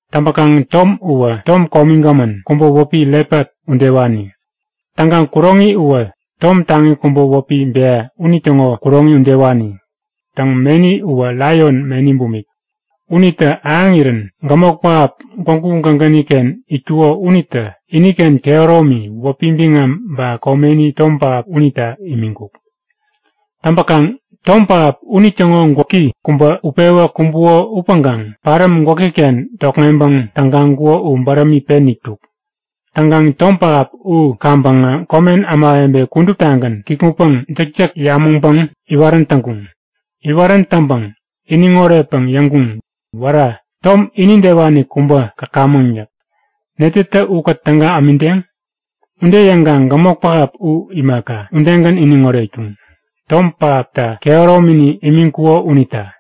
Täŋpäkaŋ tom uwä tom komigämän kubä wäpi lepat udewani. Täŋkaŋ kuroŋi uwä tom taŋi kubä wäpi bea unitäŋo kuroŋi udewani. Täŋ, meni uwä laion meni bumik. Unitä ahäŋirän gämok pähap gwägu gägäni-ken itkuko unitä iniken kehäromi, wäpi biŋam ba komeni, tom pähap unita imiŋkuk. Täŋpäkaŋ tom pähap unitäŋo gwäki kubä utpewä kumbuko upäŋkaŋ paräm gwäki-ken tokŋeŋpäŋ tägaŋkuko u bärämi pen itkuk. Täŋkaŋ tom pähap u kaŋpäŋä komen ämawebe kuduptagän kikŋutpäŋ jäkjäk yamäŋpäŋ iwarän täŋkuŋ. Iwarän täŋpäŋ iniŋ oretpäŋ yäŋkuŋ; Wära, tom inidewani kubä käkamäŋ yäk. Netätä ukät täga ämideŋ? Ude yäŋkaŋ gämok pähap u imaka, udegän iniŋ oretkuŋ, tom pähapta kehäromini imiŋkuko unita.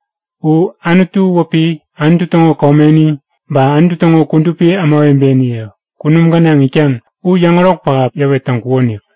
U Anutu wäpi, Anutu täŋo komeni, ba Anutu täŋo kudupi ämawebeniye kunum gänaŋ itkaŋ u yäŋärok pähap yäwet täŋkukonik.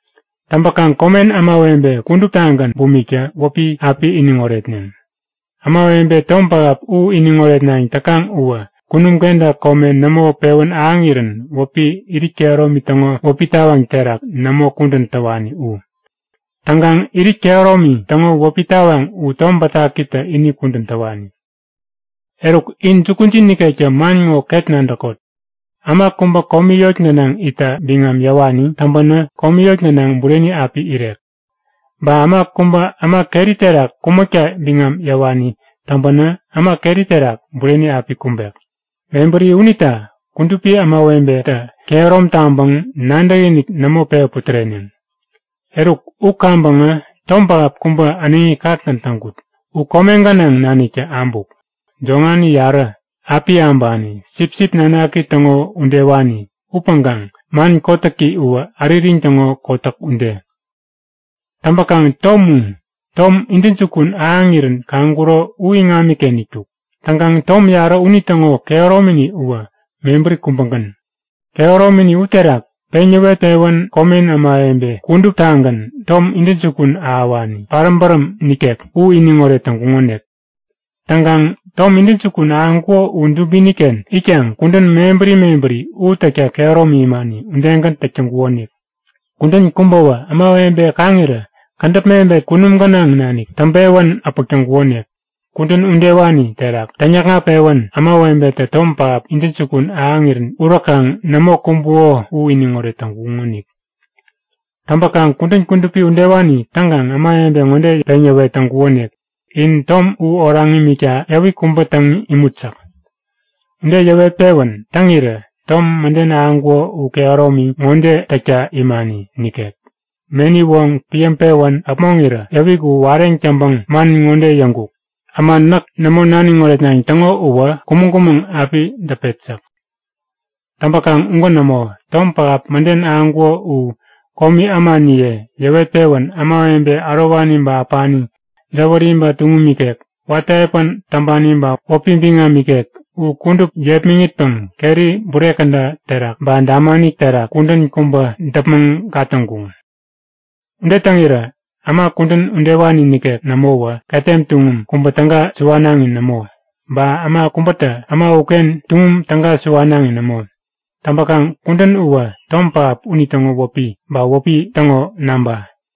Täŋpäkaŋ komen ämawebe kuduptagän bumiktä wäpi api iniŋ oretneŋ. Ämawebe tom pähap u iniŋ oretnayäŋ täkaŋ uwä kunum kenta kome nämo pewän ahäŋirän wäpi irit kehäromi täŋo wäpi tawaŋ terak nämo kudän täwani u. Täŋkaŋ irit kehäromi täŋo wäpi tawaŋ u Tom Bätakitä ini kudän täwani. Eruk, in jukujin nikektä man ŋo ket nadäkot; Äma kubä komi yot gänaŋ itta biŋam yäwani täŋpänä, komi yot gänaŋ bureni api irek. Ba äma kubä äma keri terak kumäkta biŋam yäwani täŋpänä, äma keri terak bureni api kumbek. Mebäri unita kudupi ämawebetä kehärom taŋpäŋ nadäkiniki nämo pewä putäreneŋ. Eruk u kaŋpäŋä tom pähap kubä äneŋi kakgän täŋkut. U kome gänaŋ naniktä abuk. Joŋani yarä, api äbani, sipsip nanaki täŋo udewani upäŋkaŋ man kotäki uwä äririŋ täŋo kotäk ude. Täŋpäkaŋ tom u tom intäjukun ahäŋirän kaŋkuro u iŋamiken itkuk. Täŋkaŋ tom yarä unitäŋo kehäromini uwä mebäri kubägän. Kehäromini uterak peŋ yäwet-pewän komen ämawebe kuduptagän tom intäjukun ahäwani, paräm bäräm nikek u iniŋoret täŋkuŋonik. Täŋkaŋ tom intäjukun ahäŋkuko u dubini-ken itkaŋ kudän mebäri mebäri u täkta kehäromi imani udegän täk täŋkukonik. Kudän kubäwä, ämawebe kaŋirä kädäp mebet kunum gänaŋ nanik täŋpewän äpäk täŋkukonik. Kudän udewani terak täŋyäkŋat-pewän ämawebetä tom pähap intäjukun ahäŋirän uräkaŋ nämo kumbuko u iniŋoret täŋkuŋonik. Täŋpäkaŋ kudän kudupi udewani täŋkaŋ ämawebe ŋode peŋyäwet täŋkukonik; In tom u oraŋ imikta yäwik kubä täŋ imut yäk. Ude yäwet-pewän täŋirä tom mäden ahäŋkuko u kehäromi ŋode täkta imani nikek; Meni woŋ piäŋpewän äpmoŋirä yäwik u wareŋ täŋpäŋ man ŋode yäŋkuk; Äma näk nämo naniŋ oretnayäŋ täŋo uwä kumäŋ-kumäŋ api däpet yäk. Täŋpäkaŋ ugän nämo. Tom pähap mäden ahäŋkuko u komi ämaniye yäwet-pewän ämawebe ärowani ba äpani, jäwäri ba tuŋum ikek, watä epän täŋpani ba wäpi biŋam ikek u kudup yepmäŋitpäŋ keri bure käda terak ba damani terak kudän kubä däpmäŋ gatäŋkuŋ. Ude täŋirä äma kudän udewani nikek nämowä ketem tuŋum kubä täga suwanaŋi nämo, ba äma kubätä äma uken tuŋum täga suwanaŋi nämo. Täŋpäkaŋ kudän uwä tom pähap unitäŋo wäpi ba wäpi täŋo namba.